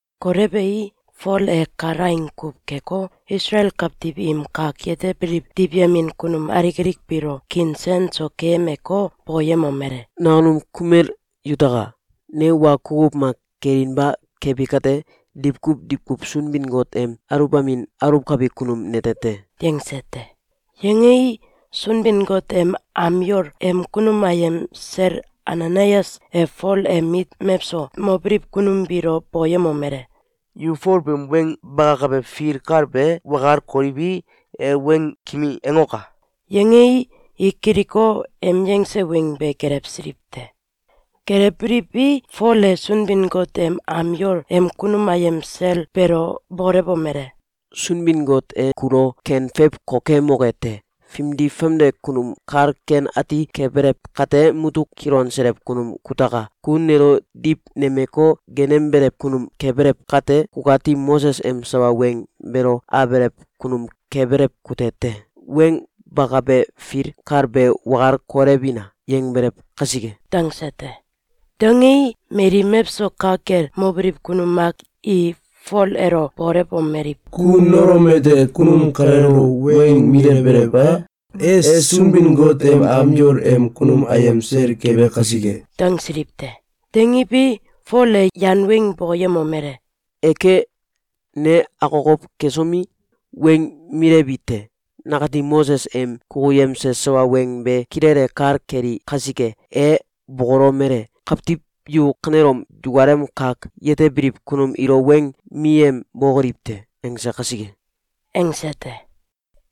Kolewei, Fol e kalaing kuw keko, Isalael kawtiw im kak yetebiliw diwyemin kunum alik alik biilo kiin sen so keyemeko, bokoyemomele: “Nakunum kumel yutaka! Ne wa kukuw mak kelinba kebi kate, diwkuw diwkuw Sunbin-Got em aluwbamin aluwkabi kunum nete te.”, yangse te. Yangei, Sunbin-Got em am yol em kunum ayem sel Ananayas e Fol em mit mewso mobiliw kunum biilo bokoyemomele: “Yu Fol beem weng bakabe fil kal be wakal koliwi, e weng kimi angoka!”, yangei, i kiliko, em yangse weng be gelewsiliw te. Gelewbiliwi, Fol e Sunbin-Got em am yol em kunum ayem sel beelo bokolewomele: “Sunbin-Got e kulo ken feiw kokemoke te! Fimdi-famde kunum kal ken ati kebelew kate, mutuk kilonselew kunum kutaka! Ku nelo diwnemeko, geenembelew kunum kebelew kate, kukati Moses em sawa weng beelo abelew kunum kebelew kute te. ‘Weng bakabe fil kal be wakal kolewina!’, yangbelew kasike.”, dangse te. Dangei, mali mewso ka kel mobiliw kunum mak i Fol elo bokolewomeliw: “Ku nolomete kunum kaleelo weng milewbelew e? E Sunbin-Got em am yol em kunum ayem sel kebe kasike!”, dangsiliw te. Dangiwi, Fol e yan weng bokoyemomele: “Eke! Ne akokow kesomi, weng milewi te. Nakati Moses em kukuyemse sawa weng be kilele kal keli kasike. E bokolomele: ‘Kawtiw yu kanelom yukalem kak yetebiliw kunum ilo weng miyembokoliw te!’, angse kasike.”, angse te.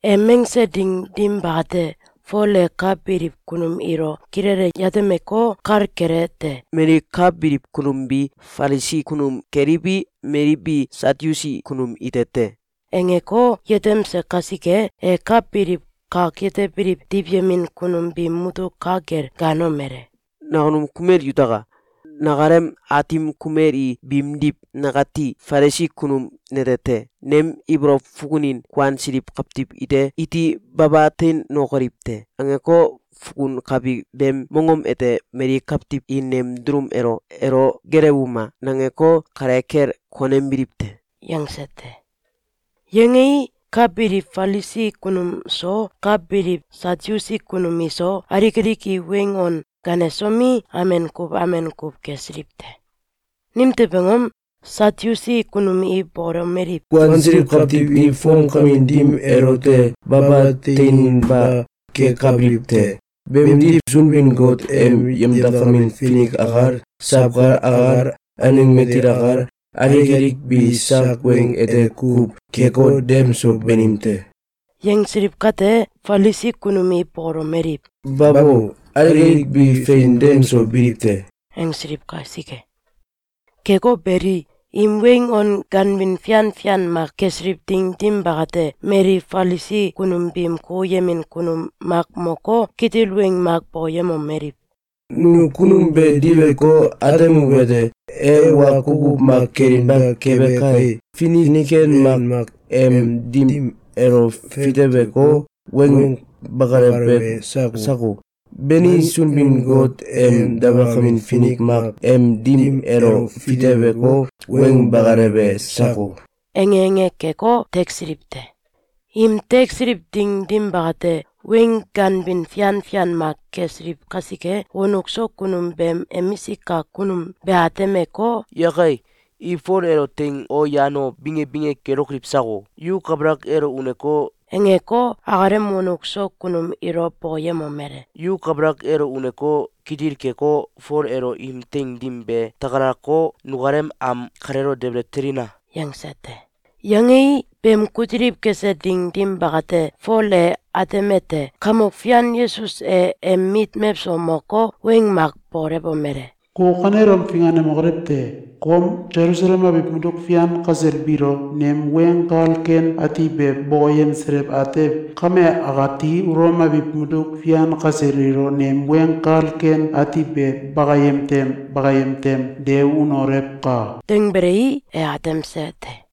Em angse ding dim bakate, Fol e ka biliw kunum ilo kilele yatemeko, kal kelete: “Mali ka biliw kunum bi Falisi kunum keliwi, mali bi Satyusi kunum ite te!”, angeko, yetemse kasike, e ka biliw kak yetebiliw diwyemin kunum biim mutuk ka kel gaanomele: “Nakunum kumel yutaka! Nakalem aatim kumeli biimdiw, nakati Falisi kunum nete te. Nem ibolow fukunin ‘Kuansiliw kawtiw iti baba teinokoliw te!’, angeko, fukunkabi beem mongom ete mali kawtiw i nem dulum elo ‘Elo geelewuma!’, nangeko, kale kel konembiliw te.”, yangse te. Yangei, ka biliw Falisi kunum so, ka biliw Satyusi kunum iso, alik alik i weng on ganesomi, amen kuw amen kuw kesiliw te. Nimtew angom? Satyusi kunum i bokolomeliw: “Kuansiliw kawtiw i fomkamin dim elote baba teininba kekabiliw te. Beemdiw, Sunbin-Got em yemdakamin finik akal, sawkal akal, aneng matil akal, alik alik bi sak weng ete kuw keko, dem so banim te.”, yangsiliw kate, Falisi kunum i bokolomeliw: “Babo! Alik alik bi fein dem so biliw te!”, angsiliw kasike. Keko beli, im weng on gaanbin fian fian mak kesiliw ding dim bakate, mali Falisi kunum biim kukuyemin kunum mak moko, kitil weng mak bokoyemomeliw: “Nu kunum be diweko, atemuwete: E wa kukuw mak kelinba kebe kai! Finik ken mak em dim elo fiteweko, weng bakalewe sako? Bani, Sunbin-Got em dabalakamin finik mak em dim elo fiteweko, weng bakalewe sako?”, ange ange keko, teksiliw te. Im teksiliw ding dim bakate, weng ganbin fian fian mak kesiliw kasike, wonuk so kunum beem emisik kak kunum be atemeko, “Yakai! I Fol elo teing o yan o binge binge kelokoliw sako?”, angeko, akalem wonuk so kunum ilo bokoyemomele: “Yu kabalak elo uneko, kitil keko, Fol elo im teing dim be takalako, nukalem am kaleelo debele telina!”, yangse te. Yangei, beem kutiliw kese ding dim bakate, Fol e atemete: Kamok Fian Yesus e em mit mewso moko, weng mak bokolewomele: “Ku kanelom finganemokolew te! Kom Selusalem abiw mutuk fian kasel biilo nem Weng Kal Ken Ati be bokoyemselew atew, kame akati Ulom abiw mutuk fian kasel ilo nem Weng Kal Ken Ati be bakayem tem bakayem tem de unolewka!”, dangbelei, e atemse te.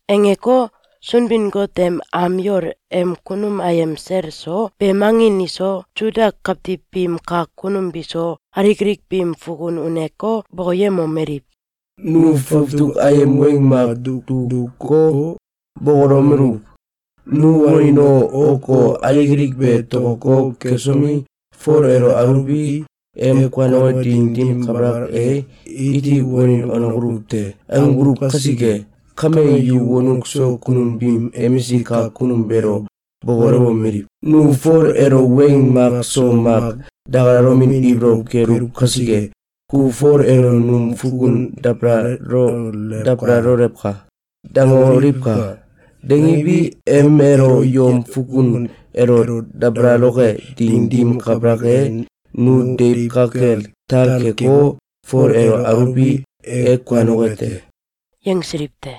Angeko, Sunbin-Got em am yol em kunum ayem sel so, beem angin iso, Suda kawtiw biim kak kunum biso, alik alik biim fukun uneko, bokoyemomeliw: “Nu fawtuk ayem weng mak dukuko, bokolomeluw: ‘Nu wanin o, ok o, alik alik be tokotoko kesomi, Fol elo aluwi, em kuanoke ding dim kabalak e, iti wanin wanokoluw te!’, angbuluw kasike kame, yu wonuk so kunum biim emisik kak kunum beelo bokolewomeliw: ‘Nu Fol elo weng mak so mak dakalalomin ibolow keluw kasike, ku Fol elo num fukun dabalalolewka!’, dangoliwka! Dangiwi, em elo yom fukun elo dabalaloke ding dim kabalak e, nu deiw ka kel tal keko, Fol elo aluwi, e kuanoke te.”, yangsiliw te.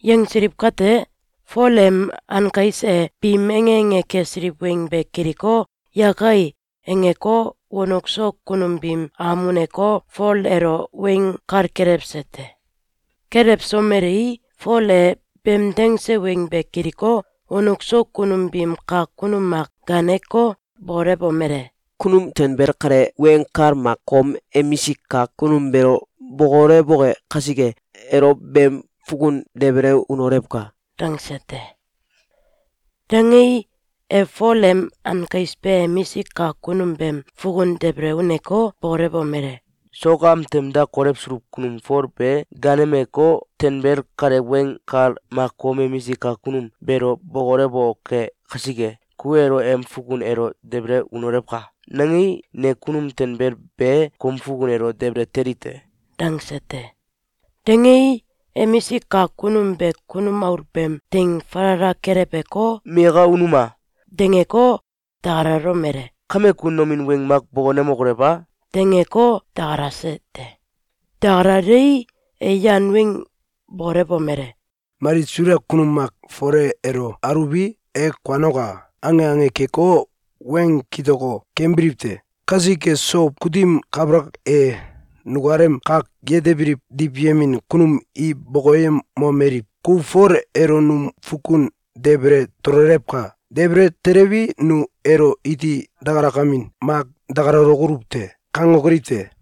Yangsiliw kate, Fol em ankais e biim ange ange kesiliw weng be kiliko, “Yakai!”, angeko, wonuk so kunum biim am uneko, Fol elo weng kal kelewse te. Kelewsomelei, Fol e beem dangse weng be kiliko, wonuk so kunum biim kak kunum mak gaaneko, bokolewomele: “Kunum tanbel kale weng kal mak kom emisik kak kunum beelo bokolewoke kasike, elo beem fukun debele unolewka!”, dangse te. Dangei, e Fol em ankais be emisik kak kunum beem fukun debele uneko, bokolewomele: “Sok am tem da kolewsuluw kunum Fol be gaanemeko, ‘Tanbel kale weng kal mak kom emisik kak kunum beelo bokolewoke kasike, ku elo em fukun elo debele unolewka!’, nangei, ne kunum tanbel be kom fukun elo debele teli te.”, dangse te. Dangei, emisik kak kunum be kunum aul beem teing falala keleweko, “Miyaka unuma!”, dangeko, dakalalomele: “Kame, ku nomin weng mak bokonemokolew a?”, dangeko, dakalase te. Dakalalei, e yan weng bokolewomele: “Mali Suda kunum mak ‘Fole elo aluwi, e kuanoka!’, ange ange keko, weng kitoko kembiliw te. Kasike, sow kutim kabalak e, nukalem kak yetebiliw diwyemin kunum i bokokemomeliw: ‘Ku Fol elo num fukun debele tololewka! Debele telewi, nu elo iti dakalakamin mak dakalalokoluw te.’, kangokoliw te.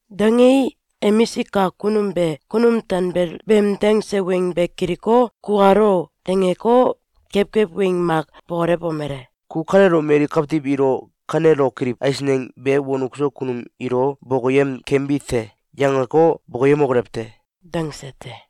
Dangei, emisik kak kunum be kunum tanbel beem dangse weng be kiliko, “Kukal o!”, dangeko, kewkew weng mak bokolewomele: “Ku kanelom mali kawtiw ilo ‘Kanelokoliw eisneng be wonuk so kunum ilo bokoyem kembi te!’, yangeko, bokoyemokolew te!”, dangse te.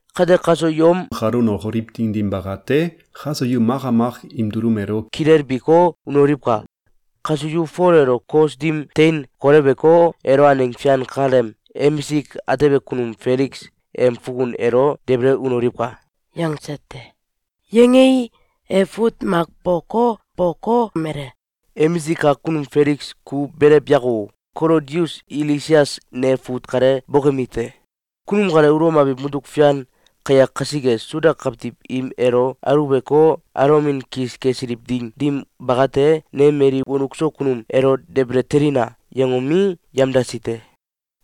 Kate, kaso yom kalo unokoliw ding dim bakate, kaso yu maka mak im dulum elo kilebiko, unoliwka! Kaso yu Fol elo kos dim tein koleweko, elo aneng fian kaleem emisik atebe kunum Feliks em fukun elo debele unoliwka!”, yangse te. Yangei, e fut mak boko, bokolomele: “Emisik kak kunum Feliks, ku belew yako! Kolodius Ilisias ne fut kale bokemi te. Kunum kale Ulom abiw mutuk fian kayak kasike, Suda kawtiw im elo aluweko, alomin kis kesiliw ding dim bakate, ne mali wonuk so kunum ‘Elo debele telina!’, yangomi, yamdasi te.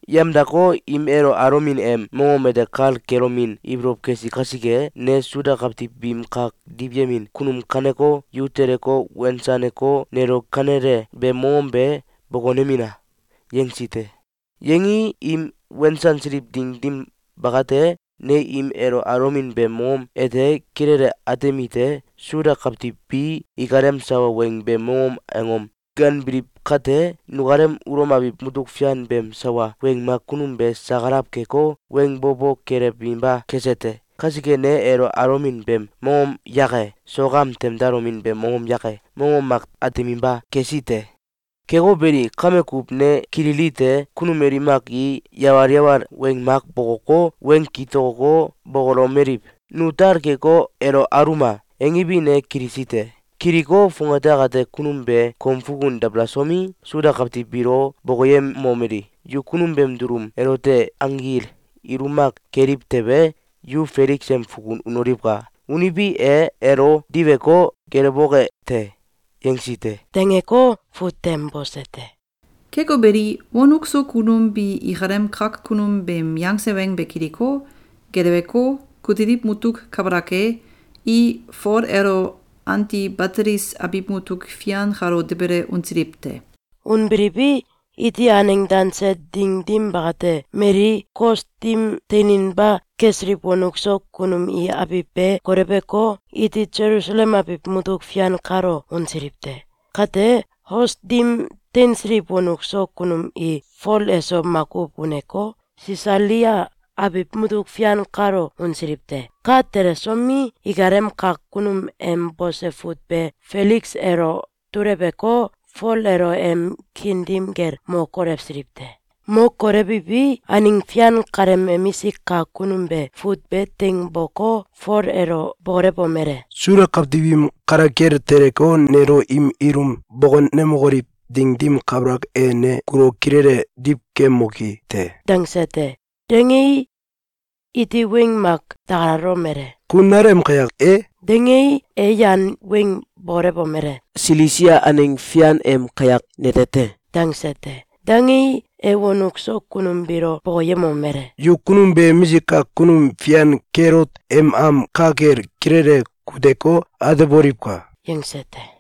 Yamdako, im elo alomin em mongom ete kal kelomin ibolow kesi kasike, ne Suda kawtiw biim kak diwyemin kunum gaaneko, ‘Yu teleko, wensaneko, nelo kanele beem mongom be bokonemina!’, yangesi te. Yangii, im wensansiliw ding dim bakate, ne im elo alomin beem mongom ete kilele atemite: Suda kawtiw bi ikalem sawa weng beem mongom angom ganbiliw kate, nukalem Ulom abiw mutuk fian beem sawa weng mak kunum be sakalaw keko, weng bo bo kelewinba kese te. Kasike, ne elo alomin beem mongom yake, sok am tem dalomin beem mongom yake, mongom mak ateminba kesi te. Keko beli, kame kuw ne kililite: Kunum mali mak i yawal yawal weng mak bokoko, weng kitokoko, bokolomeliw: ‘Nu tal keko, elo aluma!’, angiwi, ne kilisi te. Kiliko, fongate akate kunum be kom fukun dabalasomi, Suda kawtiw biilo bokoyemomeli: ‘Yu kunum beem dulum elote anggil ilum mak keliw tewe, yu Feliks em fukun unoliwka! Uniwi, e elo diweko, geelewoke te!’, yangesi te.”, dangeko, fut tem bose te. Keko beli, wonuk so kunum bi ikalem kak kunum beem yangse weng be kiliko, geleweko, kutiliw mutuk kabalak e, i Fol elo Antibatelis abiw mutuk fian kalo debele unsiliw te. Unbiliwi, iti aneng danse ding dim bakate, mali kos dim teininba kesiliw wonuk so kunum i abiw be koleweko, iti Selusalem abiw mutuk fian kalo unsiliw te. Kate, kos dim teinsiliw wonuk so kunum i Fol eso makuw uneko, Sisalia abiw mutuk fian kalo unsiliw te. Ka telesomi, ikalem kak kunum em bose fut be Feliks elo duleweko, Fol elo em kiin dim kel mo kolewsiliw te. Mo kolewiwi, aneng fian kaleem emisik kak kunum be fut be teing bokoko, Fol elo bokolewomele: “Suda kawtiw im kale kel teleko, nelo im ilum bokonemokoliw ding dim kabalak e, ne kulo kilele diwkemoki te.”, dangse te. Dangei, iti weng mak dakalalomele: “Ku nalem kayak e?”, dangei, e yan weng bokolewomele: “Silisia aneng fian em kayak nete te!”, dangse te. Dangei, e wonuk so kunum biilo bokoyemomele: “Yu kunum be emisik kak kunum fian Kelot em am ka kel kilele kuteko, ateboliwka!”, yangse te.